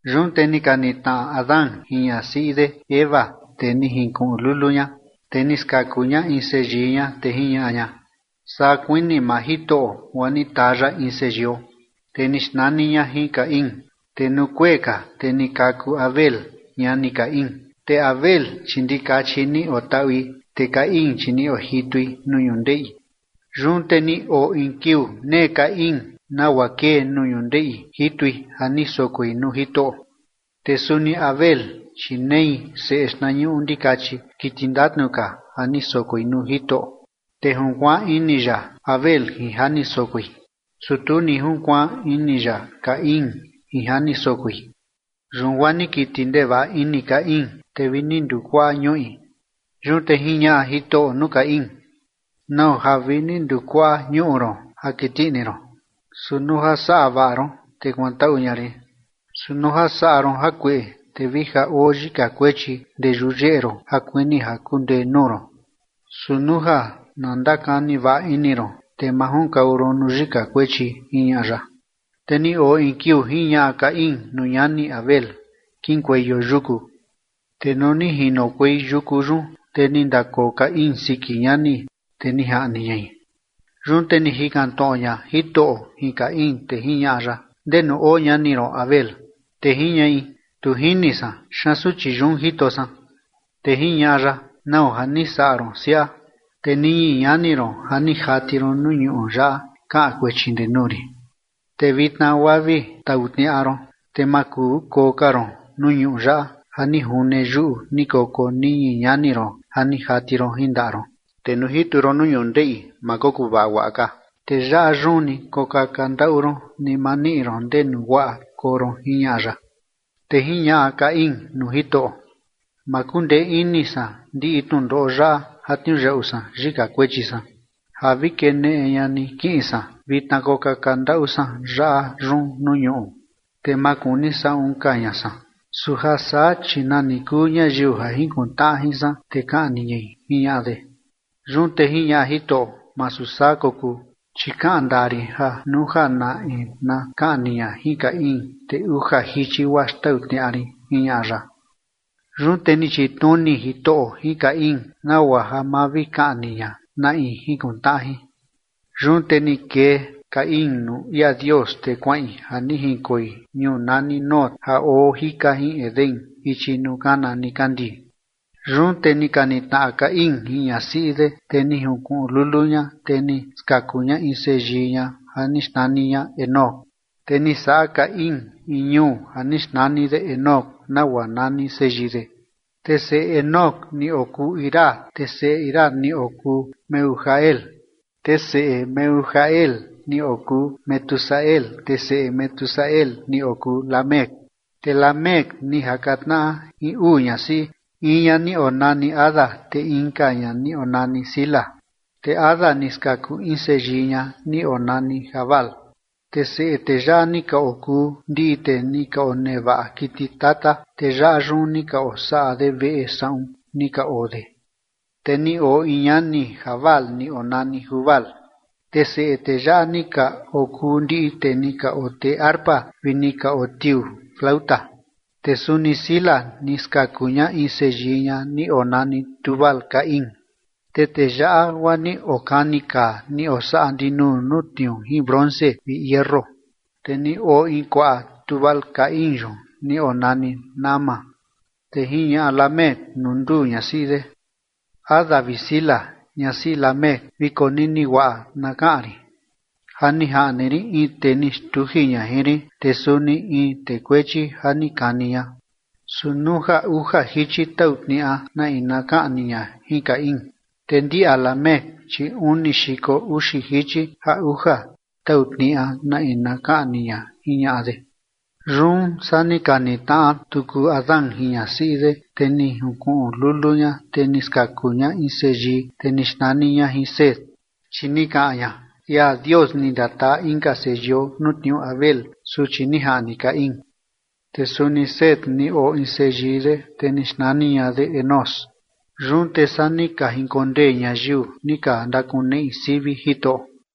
Yun te ni ka nitnaꞌa Adán jin ñasiꞌi de Eva, te ni jinkuꞌun lulu ña, te ni skaku ña in seyii ña te jiñaꞌa ña: ―Saa kuini maa Jitoꞌo guaa ni taa ya in seyio. Te ni xnani ña jin Caín. Te nuu kuee ka, te ni kaku Abel ñani Caín. Te Abel, chi ndikachi ni otaꞌui, te Caín chi ni ojitui nuu ñundeꞌi. Yun te ni oo in kiuu nee Caín nagua kee nuu ñundeꞌi jitui ja ni sokoi nuu Jitoꞌo. Te suni Abel, chi nei seꞌe xtnañuꞌu ndikachi kiti ndatnu ka ja ni sokoi nuu Jitoꞌo, te junkuaan ini ya Abel jin ja ni sokoi. Su tu ni junkuaan ini ya Caín jin ja ni sokoi. Yun guaa ni kiti ndevaꞌa ini Caín, te vi ni ndukuaꞌa ñuꞌi. Yun te jiñaꞌa Jitoꞌo nuu Caín: ―¿Nau ja vi ni ndukuaꞌa ñuꞌu ron ja kiti ini ron? Su nuu ja saꞌa vaꞌa ron, te kuantaꞌu ña rin. Su nuu ja saꞌa ron jakueꞌe, te vi ja oo yika kuechi ndee yuyeꞌe ron ja kuini ja kundee nuu ron. Su nuu ja na ndakani vaꞌa ini ron, te ma junkau ron nuu yika kuechi ―jiñaꞌa ya. Te ni oo in kiuu jiñaꞌa Caín nuu ñani Abel: ―Kiꞌinkueio yuku. Te nuu ni jinokuei yuku yun, te ni ndakoo Caín siki ñani, te ni jaꞌni ñai. Yun te ni jikan tnoꞌo ña Jitoꞌo jin Caín, te jiñaꞌa ya: ―¿Ndenu oo ñani ron Abel? Te jiñaꞌi: ―Tu jini san. ¿Xaan suchi yun jito san? Te jiñaꞌa ya: ―¿Nau ja ni saꞌa ron siaꞌa? Te niñi ñani ron ja ni jati ron nuu ñuꞌu yaꞌa kaꞌan kuechi ndee nuu rin. Te vitna guaa vi tau tniaꞌa ron, te ma kuu koo ka ron nuu ñuꞌu yaꞌa ja ni june yuꞌu ni koko niñi ñani ron ja ni jati ron jin ndaꞌa ron. Te nuu jitu ron nuu ñundeꞌi ma kokuvaꞌa guaꞌa ka, te yaꞌa yun ni kokaka ndaꞌu ron ni ma niꞌi ron ndenu guaꞌa koo ron ―jiñaꞌa ya. Te jiñaꞌa Caín nuu Jitoꞌo: ―Ma kundee ini san ndiꞌi tnundoꞌo yaꞌa ja tniuyaꞌu san yika kuechi san ja vi keneꞌe ña ni kiꞌin san vitna kokaka ndaꞌu san yaꞌa yun nuu ñuꞌu, te ma kuni saꞌun ka ña san. Su ja saa, chi nani kuu ñayiu ja jinkuntnaꞌa jin san te kaꞌni ñai ―jiñaꞌa de. Yun te jiñaꞌa Jitoꞌo: ―Masu saa kokuu, chi kaꞌan ndaa rin ja nuu ja na in na kaꞌni ña jin Caín, te uja jichi guaa xtau tniaꞌa rin ―jiñaꞌa ya. Yun te ni chitnuni Jitoꞌo jin Caín nagua ja ma vi kaꞌni ña na in junkuntnaꞌa jin. Yun te ni kee Caín nuu ia Dios, te kuaꞌin ja ni jinkoi ñuu nani Nod ja oo jika jin Edén ichi nuu kana nikandii. Yun te ni ka nitnaꞌa Caín jin ñasiꞌi de, te ni jinkuꞌun lulu ña, te ni skaku ña in seyii ña ja ni xnani ña Enoc. Te ni saꞌa Caín in ñuu ja ni xnani de Enoc, nagua nani seyii de. Te seꞌe Enoc ni okuu Irad, te seꞌe Irad ni okuu Mehujael, te seꞌe Mehujael ni okuu Metusael, te seꞌe Metusael ni okuu Lamec. Te Lamec ni jaka tnaꞌa jin uu ñasiꞌi, in ña ni onani Ada, te inka ña ni onani Zila. Te Ada ni skaku in seyii ña ni onani Jabal, te seꞌe tee yaꞌa ni ka okuu ndiꞌi tee ni ka onevaꞌa kiti tata, te yaꞌa yun ni ni ka osaꞌa de veꞌe saꞌun ni ka oo de. Te ni oo in ñani Jabal ni onani Jubal, te seꞌe tee yaꞌa ni ka okuu ndiꞌi tee ni ka otee arpa vi ni ka otiuu tnuyoo. Te suni Zila ni skaku ña in seyii ña ni onani Tubal-caín, te tee yaꞌa guaa ni okani kaa ni osaꞌa ndinuu nuu tniuu jin bronce vi hierro. Te ni oo in kuaꞌa Tubal-caín yun ni onani Naama. Te jiñaꞌa Lamec nuu nduu ñasiꞌi de: Ada vi Zila, ñasiꞌi Lamec, vi konini guaꞌa na kaꞌan rin. Ja ni jaꞌni rin in tee ni xtuji ña jin rin, te suni in tee kuechi ja ni kani ña. Su nuu ja uja jichi tau tniaꞌa na in na kaꞌni ña jin Caín, te ndia Lamec, chi uni xiko uxi jichi ja uja tau tniaꞌa na in na kaꞌni ña. Jiñaꞌa de. Yun saa ni ka nitnaꞌa tuku Adán jin ñasiꞌi de, te ni junkuꞌun lulu ña, te ni skaku ña in seyii, te ni xnani ña jin Set, chi ni kaꞌan ña: ―Ia Dios ni ndataa inka seyio nuu tniuu Abel suchi ni jaꞌni Caín. Te suni Set ni oo in seyii de, te ni xnani ña de Enós. Yun te saa ni ka jinkondee ñayiu ni ka ndakakuneꞌi sivi Jitoꞌo.